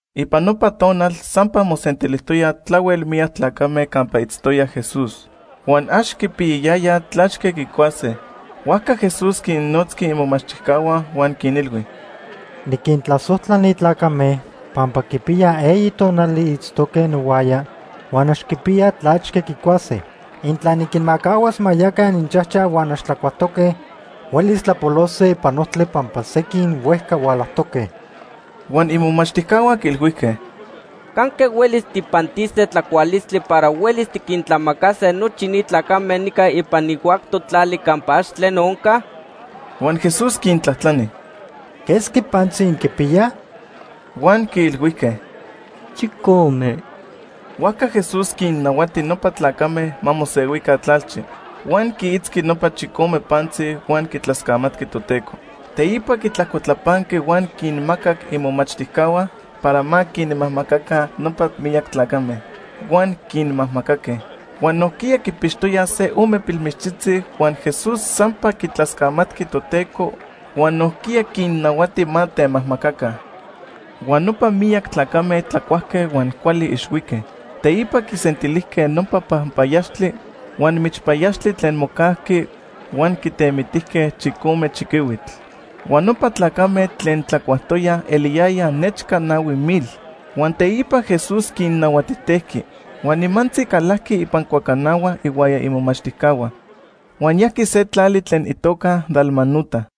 Ipan nopa tonal sampa mosentilijtoyaj tlahuel miyac tlacame campa itztoya Jesús. Huan ax quipiyayayaj tlachque quicuase, huajca Jesús quinnotzqui imomachtijcahua huan quinilhui: ―Niquintlasojtla ni tlacame pampa quipiya eyi tonali itztoque nohuaya huan ax quipiyaj tlachque quicuase. Intla niquinmacahuas ma yaca ininchajchaj huan ax tlacuajtoque, huelis tlapolose ipan ojtli pampa sequin huejca hualajtoque. Huan imomachtijcahua quiilhuijque: ―¿Canque huelis tijpantise tlacualistli para huelis tiquintlamacase nochi ni tlacame nica ipan ni huactoc tlali campa ax tleno onca? Huan Jesús quintlajtlani: ―¿Quesqui pantzi inquipiyaj? Huan quiilhuijque: ―Chicome. Huajca Jesús quinnahuati nopa tlacame ma mosehuica tlalchi. Huan quiitzqui nopa chicome pantzi huan quitlascamatqui Toteco. Teipa quitlajcotlapanqui huan quinmacac imomachtijcahua para ma quinmajmacaca nopa miyac tlacame. Huan quinmajmacaque. Huan nojquiya quipixtoyaj se ome pilmichtzitzi, huan Jesús sampa quitlascamatqui Toteco huan nojquiya quinnahuati ma temajmacaca. Huan nopa miyac tlacame tlacuajque huan cuali ixhuique. Teipa quisentilijque nopa panpayaxtli huan michpayaxtli tlen mocajqui huan quitemitijque chicome chiquihuitl. Huan nopa tlacame tlen tlacuajtoyaj eliyayaj nechca nahui mil. Huan teipa Jesús quinnahuatijtejqui. Huan nimantzi calajqui ipan cuacanahua ihuaya imomachtijcahua, huan yajqui se tlali tlen itoca Dalmanuta.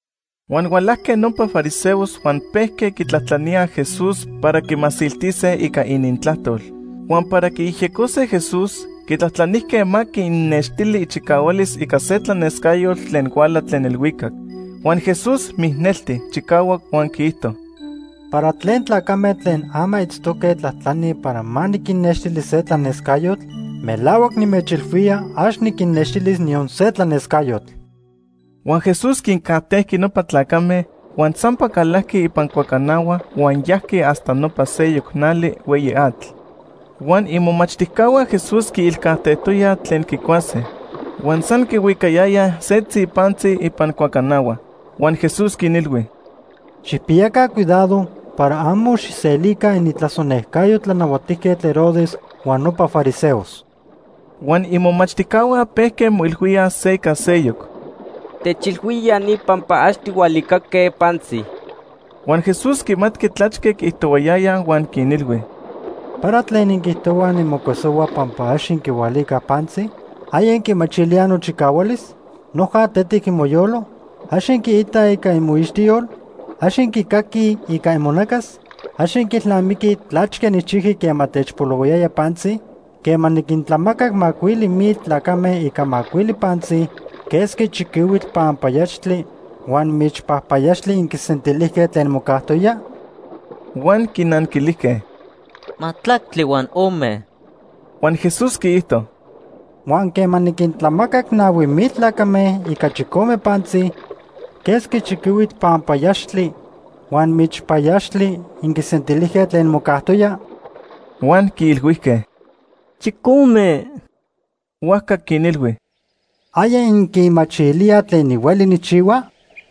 Huan hualajque nopa fariseos huan pejque quitlajtlaníaj Jesús para quimasiltise ica inintlajtol. Huan para quiyejyecose Jesús, quitlajtlanijque ma quinnextili ichicahualis ica se tlanescayotl tlen huala tlen elhuicac. Huan Jesús mijnelti chicahuac huan quiijto: ―¿Para tlen tlacame tlen ama itztoque tlajtlanij para ma niquinnextili se tlanescayotl? Melahuac nimechilhuía ax niquinnextilis niyon se tlanescayotl. Huan Jesús quincajtejqui nopa tlacame, huan sampa calajqui ipan cuacanahua huan yajqui hasta nopa seyoc nali hueyi atl. Huan imomachtijcahua Jesús quiilcajtejtoyaj tlen quicuase, huan san quihuicayayaj setzi pantzi ipan cuacanahua. Huan Jesús quinilhui: ―Xijpiyaca cuidado para amo xijselica inintlasonejcayo Tlanahuatijquetl Herodes huan nopa fariseos. Huan imomachtijcahua pejque moilhuíaj se ica seyoc: “Techilhuía ya ni pampa ax tijhualicaque pantzi.” Huan Jesús quimatqui tlachque quiijtohuayayaj huan quinilhui: ―¿Para tlen inquiijtohuaj nimocuesohua pampa ax inquihualicaj pantzi? ¿Aya inquimachilíaj nochicahualis? ¿Noja tetic imoyolo? ¿Ax inquiitaj ica imoixtiyol? ¿Ax inquicaquij ica imonacas? ¿Ax inquiilnamiquij tlachque nijchijqui quema techpolohuayaya pantzi? Quema niquintlamacac macuili mil tlacame ica macuili pantzi, ¿quesqui chiquihuitl panpayaxtli huan michpayaxtli inquisentilijque tlen mocajtoya? Huan quinanquilijque: ―Majtlactli huan ome. Huan Jesús quiijto: ―Huan quema niquintlamacac nahui mil tlacame ica chicome pantzi, ¿quesqui chiquihuitl panpayaxtli huan michpayaxtli inquisentilijque tlen mocajtoya? Huan quiilhuijque: ―Chicome. Huajca quinilhui: ―¿Aya inquimachilíaj tlen nihueli nijchihua?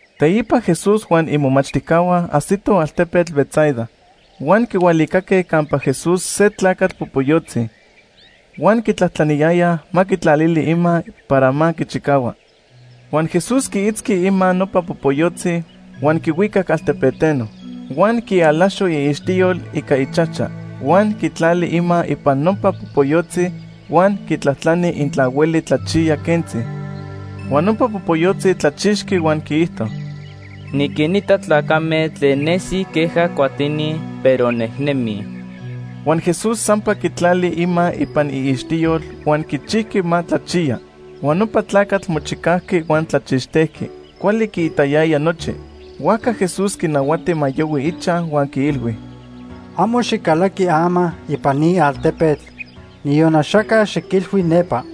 Teipa Jesús huan imomachtijcahua ajsitoj altepetl Betsaida. Huan quihualicaque campa Jesús se tlacatl popoyotzi. Huan quitlajtlaniyayaj ma quitlalili ima para ma quichicahua. Huan Jesús quiitzqui ima nopa popoyotzi huan quihuicac altepeteno. Huan quialaxo iixtiyol ica ichajcha huan quitlali ima ipan nopa popoyotzi huan quitlajtlani intla hueli tlachiya quentzi. Huan nopa popoyotzi tlachixqui huan quiijto: ―Niquinita tlacame tlen nesij queja cuatini, pero nejnemij. Huan Jesús sampa quitlali ima ipan iixtiyol huan quichijqui ma tlachiya. Huan nopa tlacatl mochicajqui huan tlachixtejqui. Cuali quiitayaya nochi. Huajca Jesús quinahuati ma yohui ichaj huan quiilhui: ―Amo xicalaqui ama ipan ni altepetl niyon axaca xiquilhui nepa.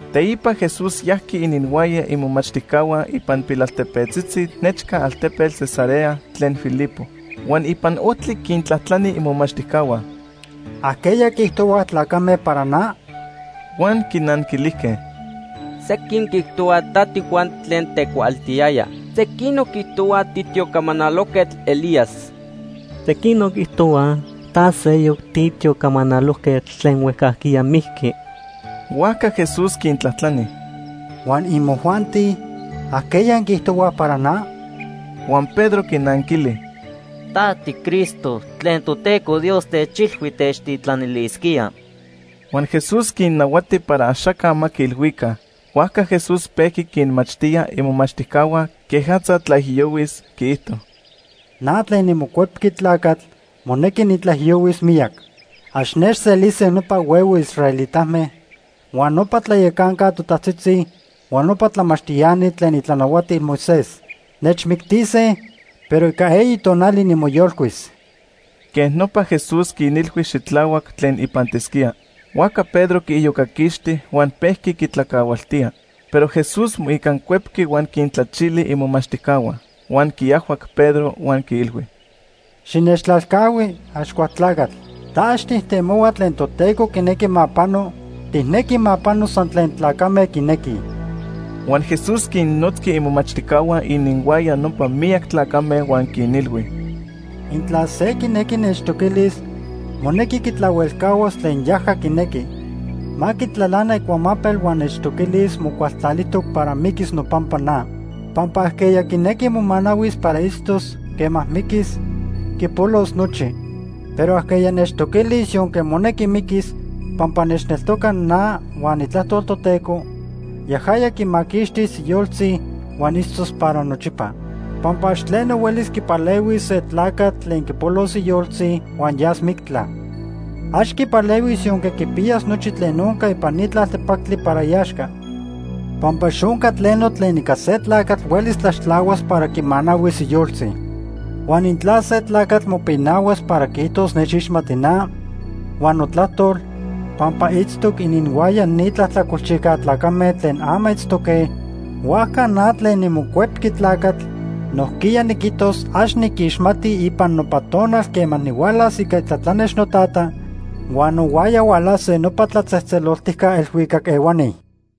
Teipa Jesús yajqui ininhuaya imomachtijcahua ipan pilaltepetzitzi nechca altepetl Cesarea tlen Filipo. Huan ipan ojtli quintlajtlani imomachtijcahua: ―¿Ajqueya quiijtohuaj tlacame para na? Huan quinanquilijque: ―Sequin quiijtohuaj ta tiJuan tlen tecuaaltiyaya. Sequinoc quiijtohuaj titiocamanalojquetl Elías. Sequinoc quiijtohuaj ta seyoc titiocamanalojquetl tlen huejcajquiya mijqui. Huajca Jesús quintlajtlani: ―Huan imojuanti, ¿ajqueya inquiijtohuaj para na? Huan Pedro quinanquili: ―Ta tiCristo tlen Toteco Dios techilhui techtitlanilisquía. Huan Jesús quinnahuati para axaca ma quiilhuica. Huajca Jesús pejqui quinmachtía imomachtijcahua quejatza tlaijiyohuis. Quiijto: ―Na tlen niMocuepqui Tlacatl monequi nitlaijiyohuis miyac. Ax nechselise nopa huehue israelitame, huan nopa tlayacanca totajtzitzi, huan nopa tlamachtiani tlen itlanahuatil Moisés. Nechmictise, pero ica eyi tonali nimoyolcuis. Quej nopa Jesús quinilhui xitlahuac tlen ipantisquía. Huajca Pedro quiiyocaquixti huan pejqui quitlacahualtía. Pero Jesús moicancuepqui huan quintlachili imomachtijcahua. Huan quiajhuac Pedro huan quiilhui: ―Xinechtlalcahui, Axcualtlacatl. Ta ax tijtemohua tlen Toteco quinequi ma pano, tijnequi ma pano san tlen tlacame quinequij. Huan Jesús quinnotzqui imomachtijcahua ininhuaya nopa miyac tlacame huan quinilhui: ―Intla se quinequi nechtoquilis, monequi quitlahuelcahuas tlen yaja quinequi. Ma quitlalana icuamapel huan nechtoquilis mocualtlalijtoc para miquis nopampa na. Pampa ajqueya quinequi momanahuis para itztos, quema miquis, quipolos nochi. Pero ajqueya nechtoquilis yonque monequi miquis pampa nechneltoca na huan itlajtol Toteco, yajaya quimaquixtis iyoltzi huan itztos para nochipa. Pampa ax tleno huelis quipalehuis se tlacatl tlen quipolos iyoltzi huan yas mictla. Ax quipalehuis yonque quipiyas nochi tlen onca ipan ni tlaltepactli para iaxca. Pampa ax onca tleno tlen ica se tlacatl huelis tlaxtlahuas para quimanahuis iyoltzi. Huan intla se tlacatl mopinahuas para quiijtos nechixmati na huan notlajtol, pampa itztoc ininhuaya ni tlajtlacolchijca tlacame tlen ama itztoque, huajca na tlen niMocuepqui Tlacatl nojquiya niquijtos ax niquixmati ipan nopa tonal quema nihualas ica itlatlanex noTata, huan nohuaya hualase nopa tlatzejtzeloltijca elhuicac ehuani.